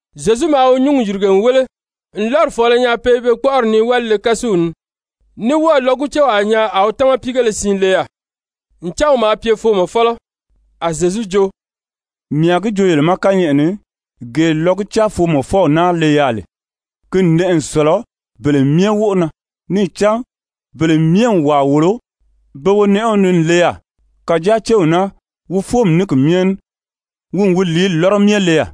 Zyezu maa wi nyúngi yìrige n wéle n lɔ́ri fɔ̀ɔlɔ nyaa pe i be kpɔ́ʔɔri nii wálile-kásuw ni, ní wɔ́ɔ̀ lɔgucewaa nyaa a wi támapiigéle siin le yaà, ncan wi maa pye foomɔfɔlɔ. A Zyezu jo: «Mii a gi joo yele ma kányɛʔɛ ni, gee lɔguca-foomɔfɔw naa le yaà lè, ki n nɛʔɛ n sɔ̀lɔ bele myɛ wóʔo na. Níì cán bele myɛ n wàa wòlo be wonɛʔɛw ni n le yaà. Kàjáa céw naa, wi fóomi ní ki myɛ ní, wi n wi lìíli lɔ́rɔ myɛ le yaà.»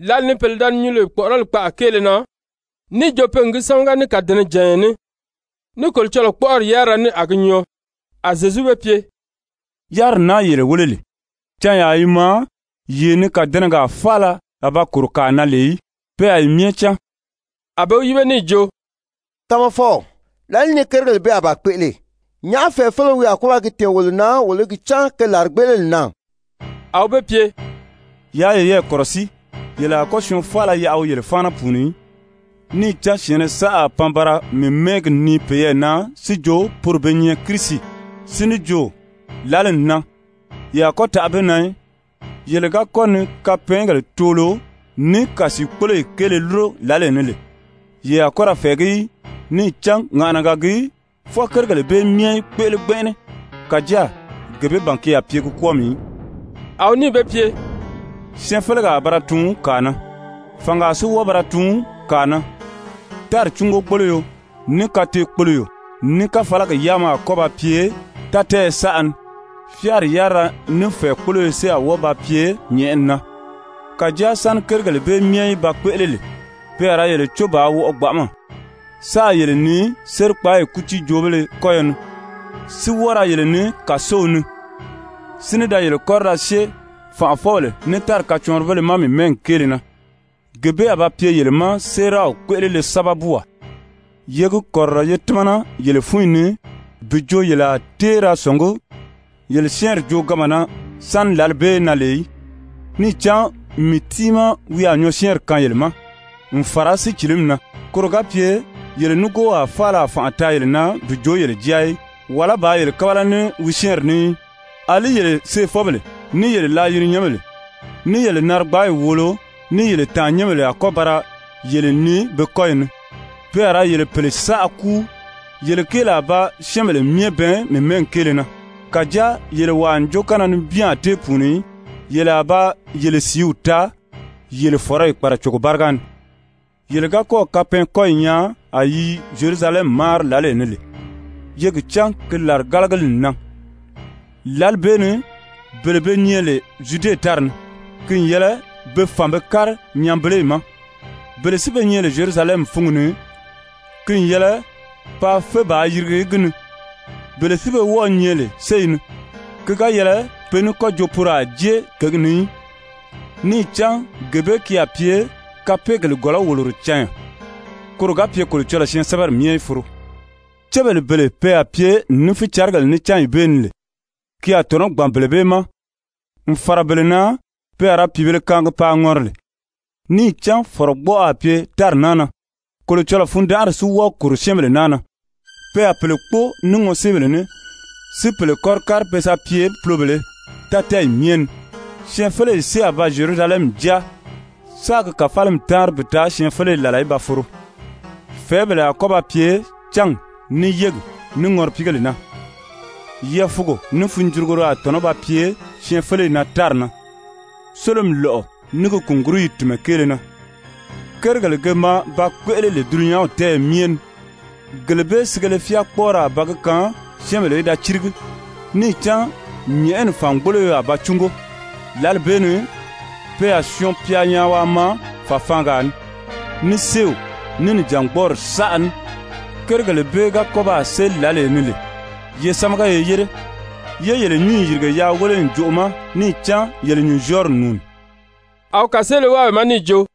Lǎli ni pèle da ni nyuu lè kpɔ̀ʔɔrɔli kpaʔa kéele na níì jo pe n gi sámaga ní kàdɛnɛjànya ní, ní Kolocɔlɔɔ kpɔ́ʔɔri yárira ní a gi nyɔɔ, a Zyezu be pye: «Yáriri naa yele wéle lè, canyaa i maa yee ni kàdɛnɛgaa faala a ba kòro kàa na lè í, pe a yi myɛ cáan.» A be wi yíbe níì jo: «Tamafɔw, làlìí ni kérigèle bee a ba kpéʔele? Nyàʔá fɛ̀ɛfeleo wi a kɔ́ ba gi tɛ̀ɛn wolo na wolo í gi cán ke làrigbeʔeleli n nan?» A wi be pye: «Yaa yeyɛɛ kɔ̀rɔsíi, yele a kɔ́ syɔɔn faala yaʔa wi yele fáana pùuni í. Níì cán syɛ̀ɛnnɛ saʔa a pan ba ra mii mɛ́ɛgi nii peyɛɛ na si jo poro be nyɛ Kirisi, si ní jo: ‹Lǎli n nan.› Ye a kɔ́ taʔa be na í. Yele ga kɔ́ ni kapɛɛngèle toolo ní kàsiikpoloyi kéele lúro lǎlee ni lè, ye a kɔ́ ra fɛ̀ɛgí í, níì cán ŋàʔanaga gii fwɔɔ kérigèle bee myɛ í kpéʔele gbɛnʔɛnɛ. Kàjáa gee bee ban ki a pye gi kwɔ́ɔmi í.» A wi níì be pye: «Syɛɛnfelegaa a ba ra tuun kàa na, fàngaa si wɔ́ɔ ba ra tuun kàa na. Tári cúngogboloyo, ní kateekpoloyo, ní káfalagi yáama a kɔ́ ba pye tátɛɛyɛ saʔa ni. Fyáari yárira ní fɛ̀ɛkpoloyo si a wɔ́ɔ ba pye nyɛ̀ʔɛni na. Kàjáa sáni kérigèle bee myɛ í ba kpéʔele lè, pe a ra yele có bàā wɔʔɔ gbanʔama, sáā yele nii sérikpaayi kútiijoobéle kɔ́yɔ ni, si wɔ́ɔ ra yele nii kàsow ni, si ní da yele kɔ́ri da syée fànʔafɔbèle ní tári kacɔɔnribéle ma mii mɛ́ɛgi kéele na. Gee bee a ba pye yele ma séeraw kpéʔelele sábabuwaa. Ye gi kɔ̀rirɔ ye tímana yele fúnyi ni bi jo yele a tée ra sɔ̀ngí yele syɛ́ɛnri jooganma na sáni lǎli bee í nan lè í. Níì cán mii tiimaa wi a nyɔɔsyɛɛnri kaan yele ma n fàra sícilimi na, koro ga pye yele nígoowaa faala a fànʔa taa yele na bi joo yele jáa í, wàlá bàā yele kábala ní wi syɛ́ɛnri ní í. Alí yele seefɔbèle, ní yele laayirinyɛnbèle, ní yele narigbaayi wòolo, ní yele tàannyɛnbèle a kɔ́ ba ra yele nii be kɔ́yi ni, pe a ra yele pèle saʔa kúu. Yele kéeli a ba syɛ́ɛnbèle myɛ bɛɛn mii mɛ́ɛgi kéele na. Kàjáa yele wàa ǹjookanna nibin a tée pùuni í. Yele a ba yele sìíw taa yele fɔ̀rɔyi kpàracogo báriga ni. «Yele ga kɔ́ɔ̀ kapɛɛnkɔyi nyaa a yi i Zyerusalɛmi máari lǎlee ni lè, ye gi cán ki làrigalagili n nan. Lǎli bee ni bele be nyɛ lè Zyude tári ni, ki n yɛlɛ be fàn be kári nyanbeleyi ma, bele si be nyɛ lè Zyerusalɛmi fúngi ni, ki n yɛlɛ paa fé bàā yirigi gi ni, bele si be wɔ́ɔ̄ nyɛ lè séyi ni, ki ga yɛlɛ pe ní kɔ́ jo poro a jée kěgi ni í. Níì cán gee bee ki a pye kapeegèle gɔ̀lɔ́-wòloro canya, koro ga pye Kolocɔlɔɔ syɛɛnsɛbɛri myɛ í foro. Cébèle bele pe a pye ní fícarigèle ní lè cányi bee ni, ki a tɔ̀nɔ́ gbàn bele bee ma n fàra bele na pe a ra pìibēle kaangi paa ŋɔri lè! Níì cán fɔ̀rɔgbɔʔɔ a pye tári naa na, Kolocɔlɔɔ fundanʔari si wɔ́ɔ kòro syɛ́ɛnbèle naa na. Pe a pèle kpóo ní ŋɔséebèle ní, si pèle kɔ́ri kári pe sa pye pulobèlē tátɛɛyi myɛ ni. Syɛɛnfeleyi si a ba Zyerusalɛmi jáa, sáā gi kàfalimi táanri bi taa syɛɛnfeleyi làla í ba foro. «Fɛ̀ɛ́bèle a kɔ́ ba pye cángi, ní yégi, ní ŋɔripiigèle na. Yɛɛfuugo ní funjurugoro a tɔ̀nɔ́ ba pye syɛɛnfeleyi na tári na, sólomi lɔ́ʔɔ ní gi kùnguruyi tìnmɛ kéele na. Kérigèle ge maa ba kpéʔele lè dulunyanw tɛ́ɛyɛ myɛ ni, gele bee sigele fyáakpɔɔrɔ a ba gi kaan syɛ́ɛnbèle í da círigi, níì cán nyɛ̀ʔɛni fàngboloyo a ba cúngo. Lǎli bee ni ‹pe a Syɔɔn-pya nyaa waa maa fàfaangaa ni› ní séew, ní nìjangbɔɔri saʔa ní. Kérigèle bee ga kɔ́ baa séli lǎlee ni lè, ye sámaga ye yére, yé yele nyǔnyi yìrige yaa wéle ǹjoʔo ma, níì cán yele nyùnzyɔɔri n nùuni.» A wi kàseele wáa be ma níì jo: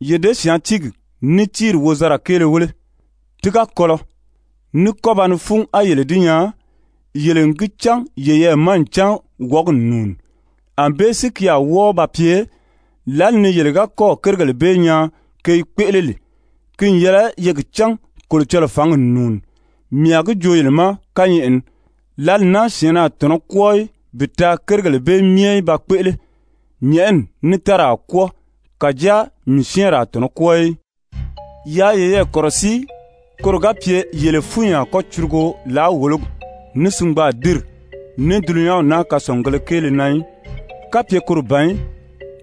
«Ye děsyaantiigi ní tíiri wozanra kéele wéle. Ti ga kɔlɔ, ní kɔ́ ba ni fún á yele di nyaa, yele n gi cán yeyɛɛ ma ncan wɔ̀ɔ́gi n nùuni. Anbée si ki a wɔ́ɔ ba pye, lǎli ni yele ga kɔ́ɔ̀ kérigèle bee nyaa ke i kpéʔele lè, ki n yɛlɛ ye gi cán Kolocɔlɔɔ fǎngi n nùuni. Mii a gi joo yele ma kányɛʔɛ ni, lǎli naa syɛ̀ɛnnɛ a tɔ̀nɔ́ kwɔ́ɔ í bi taa kérigèle bee myɛ í ba kpéʔele. Nyɛ̀ʔɛni ní tári a kwɔ́ɔ, kàjáa mii syɛ́ɛnri a tɔ̀nɔ́ kwɔ́ɔ í. «Yaa yeyɛɛ kɔ̀rɔsíi koro ga pye yele fúnyi a kɔ́ curugo làáwologi, ní singbaadinri, ní dulunyanw naa kasɔngugēle kéele na í, kapye koro ban í,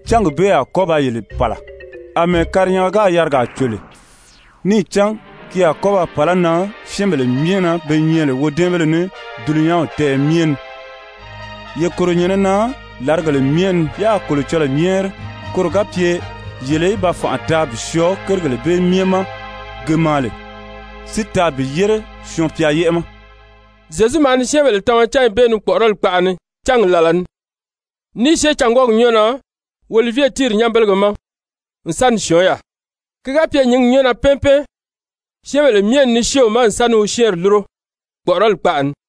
cángi bee a kɔ́ ba yele pàla àmɛɛ karinyanga gáà yarigaa cò lè, níì cán ki a kɔ́ ba pàlá nan syɛ́ɛnbèle myɛ na be nyɛ lè wodɛ́ɛnbéle ní dulunyanw tɛ́ɛyɛ myɛ ni. Ye kòro nyɛ̀nɛ na làrigèle myɛ ni, yáā Kolocɔlɔɔ nyɛ́ɛri, koro ga pye yele í ba fànʔa taa bi syɔɔ kérigèle bee myɛ ma ge maa lè, si taa bi yére Syɔɔn-pya yɛ́ʔɛ ma.» Zyezu maa ni syɛ́ɛnbèle tama cányi bee ni kpɔ̀ʔɔrɔli kpaʔa ni cángi làla ni, ní i syée cângwɔɔyi nyɔ́ɔ na Olivye tíiri nyanbelege ma, n sa ni syɔ̀ɔ́n yaà. Ki ga pye nyǐngi nyɔ́ɔ na pɛ́ɛn pɛ́ɛn, syɛ́ɛnbèle myɛ n ni syée wi ma n sa ni wi syɛ́ɛnri lúro kpɔ̀ʔɔrɔli kpaʔa ni.